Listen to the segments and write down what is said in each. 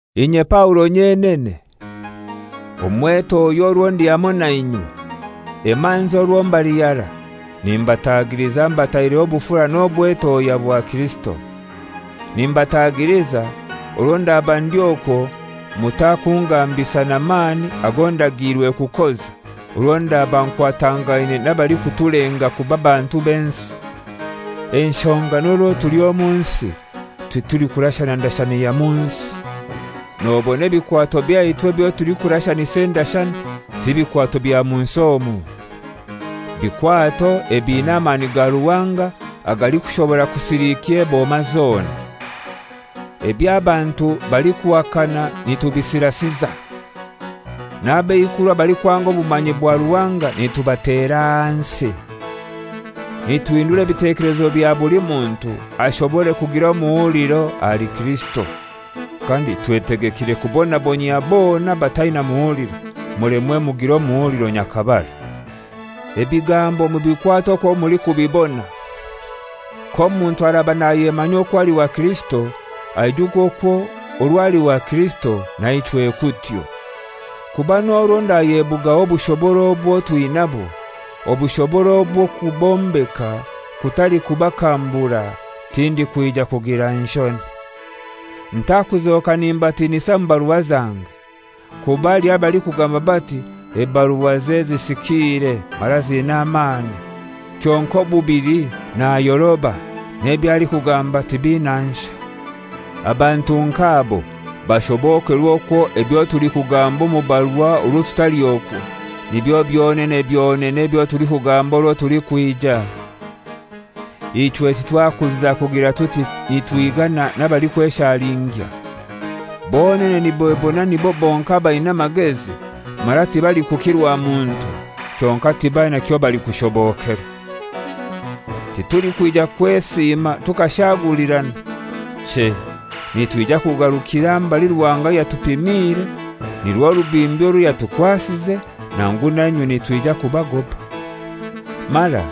Inye Paulo nyenene, omwetohya orwo ndi hamoi na inywe, emanzi orwo mbali harai, nimbatagiliza mbataireho obufura n'obwetohya bwa Kirisito. Nimbatagiliza, orwo ndaba ndi okwo mutakungambisa na mani ago ndagiirwe kukoza orwo ndaba nkwatangaine n'abalikutulenga kuba bantu b'ensi. Enshonga n'orwo tuli omu nsi titulikurashana ndashana ya mu nsi. Nobona ebikwato byaitu ebyo tulikurashanisa endashana ti bikwato bya mu nsi omu. Bikwato ebina amani ga Ruhanga agalikushobora kusilikya eboma zona. Eby'abantu balikuhakana nitubisirasiza, n'abeikuru abalikwanga obumanyi bwa Ruhanga nitubatera ahansi. Nituhindura ebitekelezo bya buli muntu ashobore kugira omuhuliro ahali Kirisito, kandi twetegekire kubonabonyia bona abataina muhuliro, mulemwe mugire omuhuliro nyakabara. Ebigambo mubikwate okwo mulikubibona. K'omuntu araba nayemanya okwo ali wa Kirisito, aijuke okwo orwo ali wa Kirisito naichwe kutyo. Kuba n'orwo ndayebugaho obushobora obwo twinabwo, obushobora obw'okubombeka, kutali kubakambura, tindikwija kugira nshoni. Ntakuzoka nimbatinisa mu barua zange. Kuba haliho abalikugamba bati, «Ebaruaze zisikiire mara ziina amani, kyonkai obubili nayoroba, n'eby'alikugamba tibina nshai.» Abantu nk'abo bashobokerwe okwo ebyo tulikugamba omu barua orwo tutali okwo, nibyo byonene byonene ebyo tulikugamba orwo tulikwija. Ichwe titwakuziza kugira tuti nitwigana n'abalikweshalingya. Bonene nibebona nibo bonkai abaina amagezi, mara tibalikukirwa muntu; kyonkai tibaina kyobalikushobokerwa. Titulikwija kwesiima tukashagulirana; chei, nitwija kugarukira mbali Ruhanga yatupimiire, nirwo rubimbi orwo yatukwasize, nangu nainywe nitwija kubagoba. Mara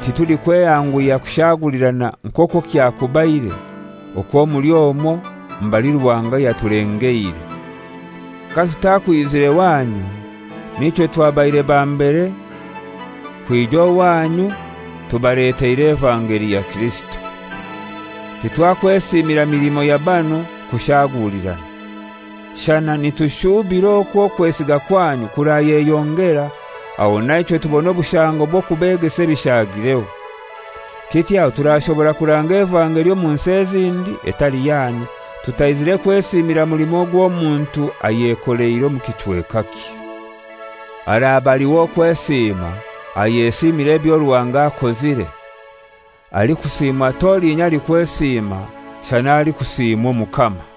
titulikwehanguhya kushagulirana nk'okwo kyakubaire okwo muli omwo mbali Ruhanga yatulengeire, katutakwizire wanyu, n'ichwe twabaire ba mbere kwija owanyu tubaleteire evangeli ya Kirisito. Titwakwesiimira milimo ya banu kushagulirana. Shana nitushubira okwo okwesiga kwanyu kurayeyongera, aho naichwe tubone obushango bw'okubegesa ebishagireho. Kityo aho turashobora kuranga evangeli omu nsi ezindi, etali yanyu, tutaizire kwesiimira mulimo ogw'omuntu ayekoleire omu kichwekakye. «Araba ali w'okwesiima ayesiimire ebyo Ruhanga akozire.» Alikusimwa t'olinya alikwesiima, shana alikusiimwa Omukama.